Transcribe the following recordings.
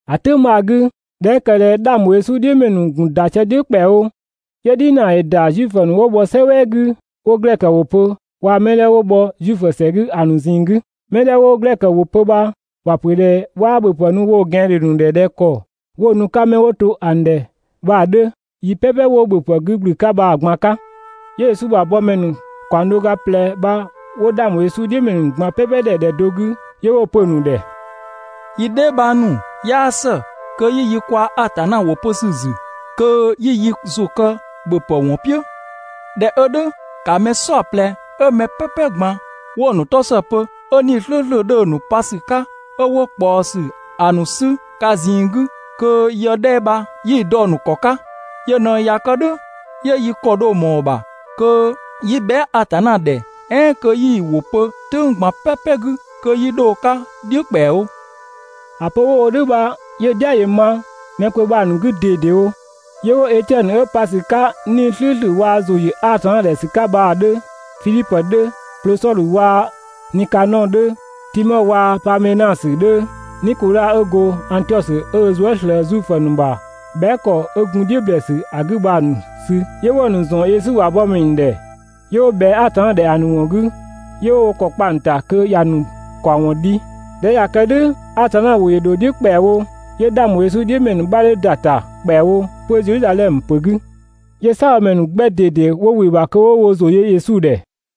‑A "tʋ̈ng bha‑ 'gü, ꞊dhɛ 'ö ‑kë ꞊dhɛ 'dhang ‑bho Yesu ‑wɔn "dhiʋ̈ ‑mɛ ‑nu ‑gun ‑da sië‑ "dhiʋ̈ ‑kpɛawo, 'yö "dhinaa ‑yö ‑da Zuifö ‑nu 'wo bhɔ "sɛ "wɛɛ 'gü 'wo glɛkö ‑wʋ pö waa‑ mɛ 'dhɛ 'wo bhɔ Zuifö ‑sɛ 'gü ‑a ‑nu ꞊zinng 'gü. Mɛ 'dhɛ 'wo glɛkö ‑wʋ pö bha, ‑wa ‑pö ꞊dhɛ 'waa ‑bhöpë nu woo‑ ꞊gɛandhe ‑nu ‑dhɛ ꞊dhɛ ‑kɔ 'wo‑ nu 'ka 'mɛ 'wo to ‑a ‑nu ‑dhɛ bha‑ 'dhö yi "pɛpɛ 'wo ‑bhöpë 'gü ‑gblü 'ka bha‑ ꞊gban 'ka. 'Yö Yesu ‑bha bɔmɛ ‑nu ‑kaɔng do ga ꞊plɛ bha 'wo 'dhang ‑bho Yesu "dhiʋ̈ ‑mɛ ‑nu ꞊gban ‑dhɛ ‑dhɛ do 'gü, 'yö 'wo‑ pö‑ ‑nu ‑dhɛ: «Yi dheebhang ‑nu, 'yaa ‑së kö 'yi yi kwaa‑ Atanna ‑wʋ pö ‑sü ‑zü kö 'yi yi ‑zʋ kë ‑bhöpë ‑wɔn "piʋ̈! ꞊Dhɛ 'ö "dhʋ̈, ‑ka mɛ "saɔplɛ 'ö mɛ "pɛpɛ ꞊gban 'wo‑ ‑nu 'tɔ ‑së pö, 'ö 'Nii‑ "slʋ̈ʋ̈slʋ̈ 'dhö‑ ‑nu pa ‑sü 'ka, 'ö 'wo ꞊kpaɔsü ‑a ‑nu 'sü ka ꞊zinng 'gü kö yë 'dhɛ bha 'yi‑ dɔ‑ ‑nu ‑kɔ 'ka. Yö ꞊në ꞊ya kë "dhʋ̈, 'yö yi ‑kɔ dho ꞊mɔɔ‑ ‑bha kö 'yi bhɛa" Atanna ‑dhɛ "ɛɛn kö 'yi‑ ‑wʋ pö "tʋ̈ng ꞊gban "pɛpɛ 'gü kö 'yi 'dho‑ 'ka "dhiʋ̈ ‑kpɛawo.» ‑A pö 'wo‑ wo "dhʋ̈ bha 'yö‑ "dhia ‑yö ma mɛ kpö bha‑ ‑nu 'gü ꞊dedewo, 'yö 'wo Etiɛnö 'ö pa ‑sü 'ka 'Nii‑ "slʋ̈ʋ̈slʋ̈ waa‑ ‑zʋ ‑yö Atanna ‑dhɛ ‑sü 'ka bha‑ 'dhö, Fidhipö 'dhö, Plosɔdhö waa‑ Nikanɔɔ 'dhö, Timɔ waa‑ Paamenasö 'dhö, Nikodha 'ö go Angtiɔsö 'ö ö zuë" ꞊slëë Zuifö ‑nu ‑bha bhɛa" ‑kɔ 'ö gun "dhiʋ̈ ‑blɛɛsü ‑a 'gü bha‑ ‑nu sü. 'Yö 'wo‑ ‑nu ‑zɔn Yesu ‑bha bɔmɛ ‑nu ‑dhɛ, 'yö 'wo ꞊bhɛa Atanna ‑dhɛ ‑a ‑nu ‑wɔn 'gü, 'yö 'wo wo ‑kɔ kpa‑ ‑nu ‑ta (kö ‑ya ‑nu ‑kaɔwɔn dhi). ꞊Dhɛ 'ö ꞊ya kë "dhʋ̈, Atanna ‑wʋ ‑yö ‑dho "dhiʋ̈ ‑kpɛawo 'yö 'dhang ‑bho Yesu "dhiʋ̈ ‑mɛ ‑nu 'bha 'dhö ‑da ‑ta ‑kpɛawo 'pö Zedhizadhɛmö ‑pö 'gü, 'yö "saabhomɛ ‑nu 'gbɛ ꞊dede 'wo ‑wɩ ‑bha kö 'wo wo ‑zʋ yö Yesu ‑dhɛ.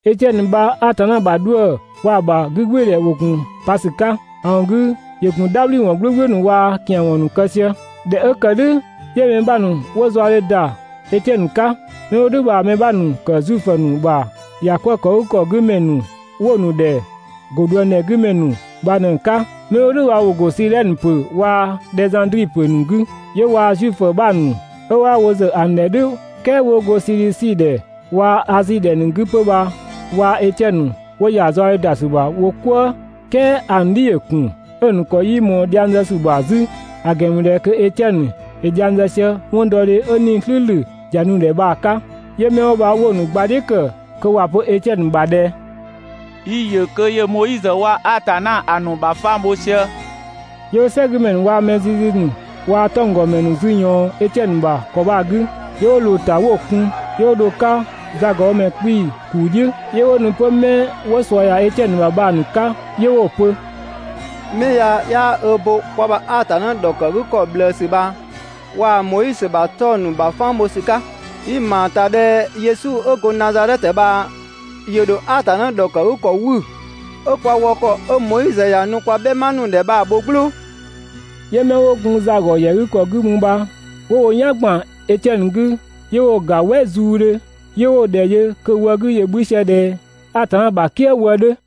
Etiɛnö bha Atanna ‑bha 'dhuë‑ waa‑ ‑bha 'gügbɩɩdhɛ ‑wo ‑gun pa ‑sü 'ka. ‑A ‑wɔn 'gü ‑yö ‑gun "dhabhliwɔn "gblʋ̈gblʋ̈ ‑nu waa‑ ‑kian ‑wɔn ‑nu kë sië. ꞊Dhɛ 'ö ‑kë "dhʋ̈, 'yö mɛ 'bha ‑nu 'wo zaɔdhe ‑da Etiɛnö 'ka. 'Mɛ 'wo "dhʋ̈ bha‑ mɛ 'bha ‑nu ‑kë Zuifö ‑nu ‑bha ‑yakwëëkëgükɔ 'gü ‑mɛ ‑nu 'wo‑ ‑nu ‑dhɛ «‑go ꞊dhuëngdhɛ 'gü ‑mɛ ‑nu» bha ꞊në‑ 'ka. 'Mɛ 'wo "dhʋ̈ bha ‑wo ‑go Sidhɛnö ‑pö waa‑ Dhɛzandri ‑pö ‑nu 'gü, 'yö waa‑ Zuifö 'bha ‑nu 'ö 'waa wo ‑zë ‑a ‑nu ‑dhɛ "dhʋ̈, "kɛɛ 'wo go Sidhisi ‑dhɛ waa‑ Azi ‑dhɛ ‑nu 'gü 'pö bha waa‑ Etiɛnö ‑nu 'wo ‑ya zaɔdhe ‑da ‑sü ‑bha wo "kwëë. "Kɛɛ ‑a ‑nu "dhi ‑yö ‑kun 'ö‑ ‑nu ‑kɔ 'yii ꞊mɔɔ dhiang zë ‑sü ‑bha 'zü, ‑a ‑gɛn ‑mü ꞊dhɛ kö Etiɛnö ‑yö dhiang zë sië 'wɔndɔdhe 'ö 'Nii‑ "slʋ̈ʋ̈slʋ̈ ‑ya nu‑ ‑dhɛ bha‑ 'ka. 'Yö 'mɛ 'wo bha 'wo mɛ ‑nu gbadhiʋ̈ ‑kë kö ‑wa pö Etiɛnö ‑bha ꞊dhɛ: «Yi‑ ‑yö kö ‑yö Moizö waa‑ Atanna ‑a ‑nu ‑bha fang bho sië.» 'Yö 'wo "sɛgümɛ ‑nu waa‑ mɛ zizi ‑nu waa‑ 'tɔnggɔmɛ ‑nu zü ꞊yɔɔn Etiɛnö ‑bha ‑kɔ bha‑ 'gü, 'yö 'wo ꞊loo‑ ‑ta 'wo‑ kun, 'yö 'wo dho‑ 'ka zagɔbhomɛ 'kpii‑ ‑kuu "dhiʋ̈. 'Yö 'wo nu 'pö 'mɛ 'wo ꞊sua ‑ya Etiɛnö ‑bha bha‑ ‑nu 'ka 'yö 'wo‑ pö: «'Mɛ ya 'yaa ö bo kwa ‑bha Atanna ‑dhɔkëgükɔ ꞊bhlëësü bha waa‑ Moizö ‑bha 'tɔng‑ ‑nu ‑bha fang bho ‑sü 'ka. Yi‑ ‑ma ‑ta ꞊dhɛ Yesu 'ö go Nazadhɛtö bha ‑yö ‑dho Atanna ‑dhɔkëgükɔ 'wü, 'ö kwa wɔ ‑kɔ 'ö Moizö ‑ya nu kwa "bhɛma ‑nu ‑dhɛ bha‑ ‑bho "glʋʋ. 'Yö 'mɛ 'wo gun za ‑gɔ ‑yɛ 'gü ‑kɔ 'gü mü bha 'wo wo "yan ‑gban Etiɛnö 'gü 'yö 'wo‑ ‑ga "wɛ zuudhö, 'yö 'wo‑ ‑dhɛ yö kö‑ wɔ 'gü‑ 'bhü sië ꞊dhɛ Atanna ‑bha "kië wë 'dhö.